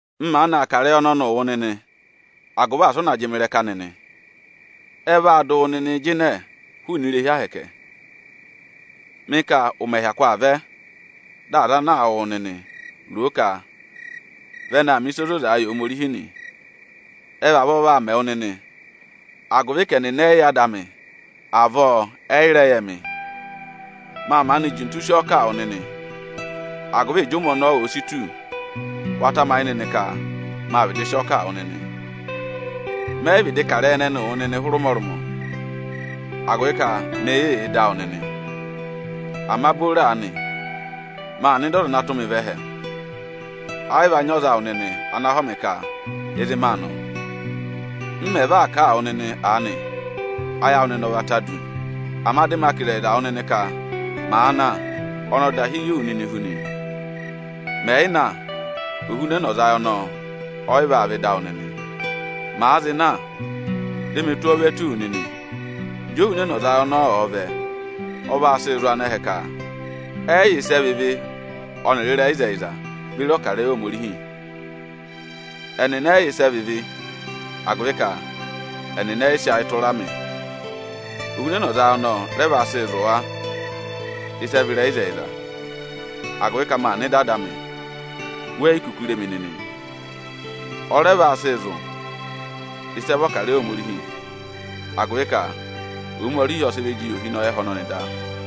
“M maanị aa kà ịrẹyị ọnọnịị wụ nịnị, agụvị asị ụ na jị mị ịrẹka nịnị. Ẹ vaa dụ wụ nịnịị jịnẹẹ hụụnị irehi Ohomorihi. Mị ka ụmẹ hyakụ aa vẹ, dị aza ana aa wụ wụ nịnị, ro o ka vị ẹnị aa mẹ̀ ịsa ozozaa yị Ohomorihi nị. Ẹ vavọọ vaa mẹ wụ nịnị, agụvị ka ẹnịnị ẹ yị yẹ Ada amị, avọọ ẹnịnị ẹ̀ yị mẹ̀ rẹ yẹ mị nị. Mâ maanị jintu sị ọọ kà a wụ nịnị, agụvị ịjị ụmẹ ọnọọ òo si tù, wa tamayị nịnị ka mâ vịdị sị ọọ kà a wụ nịnị. Mẹ yị vịdị kà ịrẹyị ẹnịnịị wụ nịnị hụrẹ ụmọrụmọ, agụvị ka mị yị yà ịdị awụ nịnị.” “Ama booro aanị, maa nọ ịdị Ọza ana tụ́ mị vẹ ẹhẹ. Ẹ yị va nyị ọza awụ nịnị ana họ̀ mị ka ịzị maa nọ. M mẹ̀ va aa kà a wụ nịnị aanị, ayị awụ nịnị ọ va ta du. Ama dị ma kà ịzẹyịza wụ nịnị ka màa na, ọ dahi yị wụ nịnị hu nị. Mẹ̀ yị na, Ohunẹnọzayị ọnọọ ọ yị vaa vẹ ịdị awụ nịnị. Màa zị na, dị mị tụ́ ọọ ve tù wu nịnị. Ịjị Ohunẹnọzayị ọnọọ ọ̀ọ vẹ, ọ vaa sị zụ̀ anẹhẹ ka ệ rị ịvị, dị ọ rẹ mẹ ka ẹ̀ yẹ ịrẹyịzẹyịza beri ọkarẹyị Ohomorihi. Ẹnịnị ệ rị ịvị, agụvị ka ẹnịnị ẹ yị sị ayị tụra mị. Ohunẹnọzayị ọnọọ rẹ vaa sị zụ̀ wa ịsị ẹ vị ịrẹyịzẹyịza, agụvị ka maa nọ ịdị Ada amị, we yi kuku re mi nịnị. Ọ rẹ vaa sịị zụ̀ ịsị ẹ vị ọkarẹyị Ohomorihi, agụvị ka Ohomorihi ọ sị ịvị jị yị ohinọyị ẹhẹ ọnọnị da.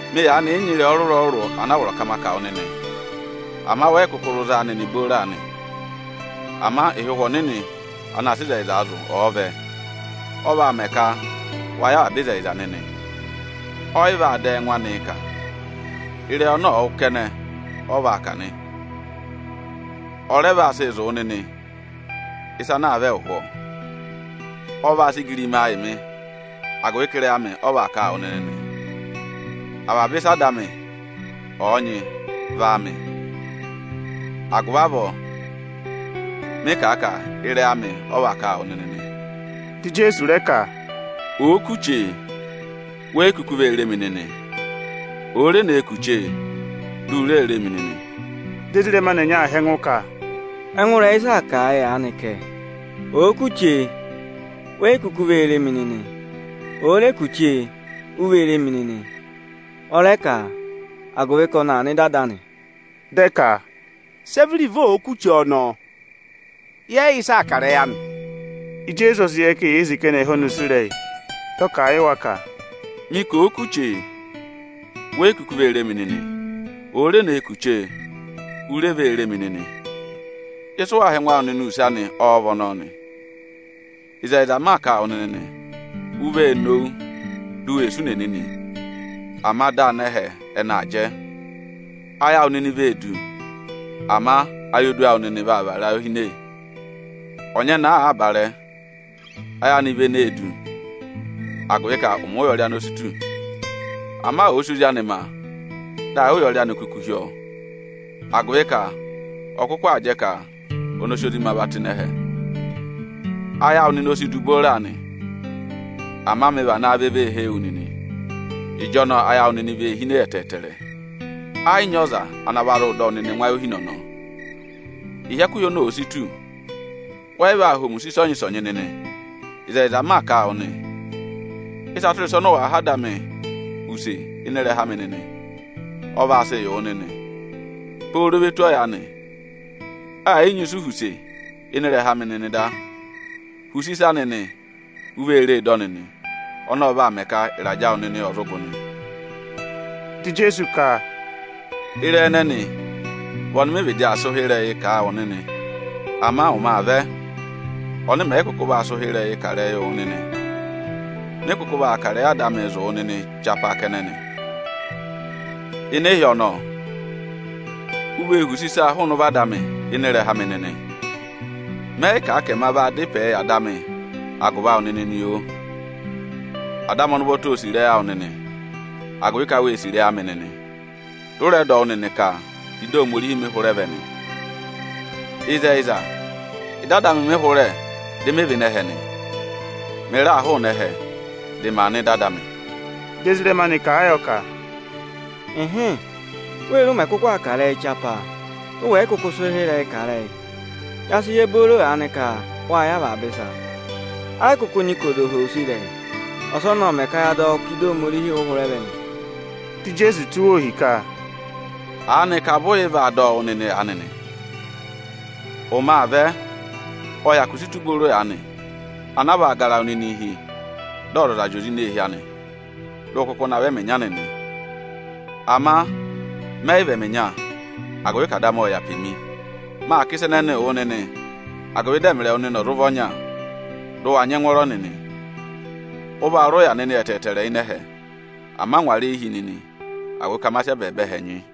“Mị yaanị yị nyị ịrẹyị ọrụrụ-ọrụrụ ana a vọrọ ka ma kà wụ nịnị; ama wẹ yị kụkụ zụ za a nịnị booro aanị. Ama ịhị Ụhwẹ Ọnịnị anaā sịị ịzẹyịzaa zụ̀, ọ̀ọ vẹ, ọ vaa mẹ ka wa yẹ avaba ịzẹyịza nịnị. Ọ yị vaa dà ẹ́ẹngụ anịị kà; ịrẹyị ọnọ ọ̀ọ wụ́ kẹnẹ, ọ vaa kà nị. Ọ rẹ vaa sịị zụ̀ wụ nịnị ịsa ana aa vẹ ụhwọọ. Ọ vaa sị igirimaa yị mị, agụvị ka ịrẹyị amị ọ vaa kà a wụ nịnị nị. Avaba ịsị Ada anị ọ̀ọ nyị vị áamị; agụvị avọọ mị kà a ka ịrẹyị amị ọ vaa kà a wụ nịnị nị.” Dị Ijeesu rẹ ka, “Òo kù chee, we yi kuku vee re mi nịnị; òo re nee kù chee, di u ree re mi nịnị.” Dị ezirẹma anị ẹnyị aa họ̀ ẹngụ ka, “Ẹngụ ịrẹyị ịsị aa kà a yị aanị kẹ, ‘Òo kù chee, we yi kuku vee re mi nịnị; òo re kù chee, u vee re mi nịnị.’ Ọ rẹ ka, ‘agụvị ka ọnị aa nọ ịdị Ada anị.’” Dị ẹ ka, “Sị ẹ vị iruvo òo kù chee ọnọọ? Yẹ yị yẹ ịsị aa kà ịrẹyị anị o.” Ijeesu ọ sị yẹ ka eyee sì ka ẹnị ẹ̀ họ̀ ọnị use ịrẹyị. Dị ọ kà a yị wa ka, “Mị ka òo kù chee, we yi kuku vee re mi nịnị, òo re ne kù chee, u re vee re mi nịnị. Ịsị ụ waa họ̀ ẹngụ awụ nịnị use anị ọ́ọ́ vị ọnọọ nị? Ịzẹyịza m maa kà a wụ nịnị nị, u vee nowu, di u wee sụ ùnè nịnị, ama dị anẹhẹ ẹnị aa jẹ. Ayị awụ nịnị vee du, ama ayodu awụ nịnị vaa vara ayohine. Ọnyẹnẹẹ àaa barẹẹ, ayị anị vị ene vee du, agụvị ka ụmẹ ụyọrị anị o si tù. Ama ọ̀ọ sị ozi anị ma, dị ayị ụyọrị anị kuku hi ọ, agụvị ka ọ kụkụ aa jẹ ka ọnị ọ sị ozi ma va ngụ ịnị ẹhẹ. Ayị awụ nịnị o si du booro aanị, ama mị vanaa vẹ vee hee wu nịnị; ịjọnọọ ayị awụ nịnị vee hine ẹtẹẹtẹrẹ. Ẹ yị nyị ọza ana va zụụ dọ wụ nịnị ẹngụ ayohine ọnọọ. “Ịhị ẹkụhị ọnọọ òo si tù, wẹ yị vaa họ̀ mị use ịsọnyị-ịsọnyị nịnị. Ịzẹyịza m maa kà a wụ nị, ịsa tụra ịsa ọnị ụ wàa họ̀ Ada amị use ịnị ịrẹha amị nịnị, ọ vaa sịị yị wụ nịnị. Pooro ve tù ọyaanị, ẹ̀ yị nyị ịsị u họ̀ use ịnị ịrẹha amị nịnị da. Huse ịsa nịnị, u vee ree dọ nịnị! Ọnọọ ọ vaa mẹ ka ịrajẹ awụ nịnị ọ̀ zụ gụ nị.” Dị Ijeesu ka, “Ịrẹyị ẹnẹnị vị ọnị mị vịdị aa sị ụhịrẹyịị kà a wụ nịnị. Ama ụmẹ aa vẹ, ọnị mẹ̀ yị kụkụ vaa sị ụhịrẹyịị kà ịrẹyịị wụ nịnị. Mị kụkụ vaa kà ịrẹyị Ada amịị zụ̀ wụ nịnị chapaa kẹnẹ nị. Ịnị ịhị ọnọọ, u vee họ̀ use ịsa hụụnị ụvọ Ada amị ịnị ịrẹha amị nịnị. Mẹ yị kà a ka ẹma vaa dá ịpẹẹ yị Ada amị agụvị awụ nịnị nị, oo! Ada amị ọnị ụvọta ô sì ịrẹyị awụ nịnị, agụvị ka wê sì ịrẹyị amị nịnị, dị ụ rẹ dọ wụ́ nịnị ka ịdị Ohomorihi mị hụrẹ vẹ nị. Ịzẹyịza, ịdị Ada amị mị hụrẹ dị mị vẹ ịnị ẹhẹ nị. Mị raa hụụnị ẹhẹ, dị ma nọ ịdị Ada amị.” Dị ezirẹma anị kà a yọ ka, “Ịhịịn, wee re ụ mẹ̀ kụkụ aa kà ịrẹyị chapaa, dị ụ wẹ̀ yị kụkụ sị ụhịrẹyị kà ịrẹyị. Ya sị yẹ booro aanị ka wâ yẹ avaba ịsa, ẹ yị kụkụ nyị ka ọza ọ̀ọ họ̀ wụ use ịrẹyị. Ọsọnị ộ mẹ̀ ka ya dọ wụ́ ka ịdị Ohomorihi ụ hụrẹ vẹ nị.” Dị Ijeesu tụ́ wa ohi ka, “Aanịka vụ ụ yị va dọ wụ́ nịnị aanị nị? Ụmẹ aa vẹ, ộ hyakụ si tù booro aanị, ana a vaa gara wụ nịnịị hi, dị ọzọza zị nọ eehi anị, dị ụ kụkụ navọ ẹmị ịnya nịnị. Ama mẹ yị vị ẹmị ịnya, agụvị ka Ada amị ộ yà pe mi. Maa kà ịsa ẹnẹnịị wụ nịnị, agụvị dị ẹmịrị ẹwụ nịnị ọ̀ zụ vị ọnya, dị ụ wa nyị ẹngwọọrọ nịnị. Ụ vaa rị ụya nịnị ẹtẹẹtẹrẹ ịnị ẹhẹ, ama ngwara eyi hi nịnị, agụvị ka ma sị ẹbẹẹba ẹhẹ nyị!”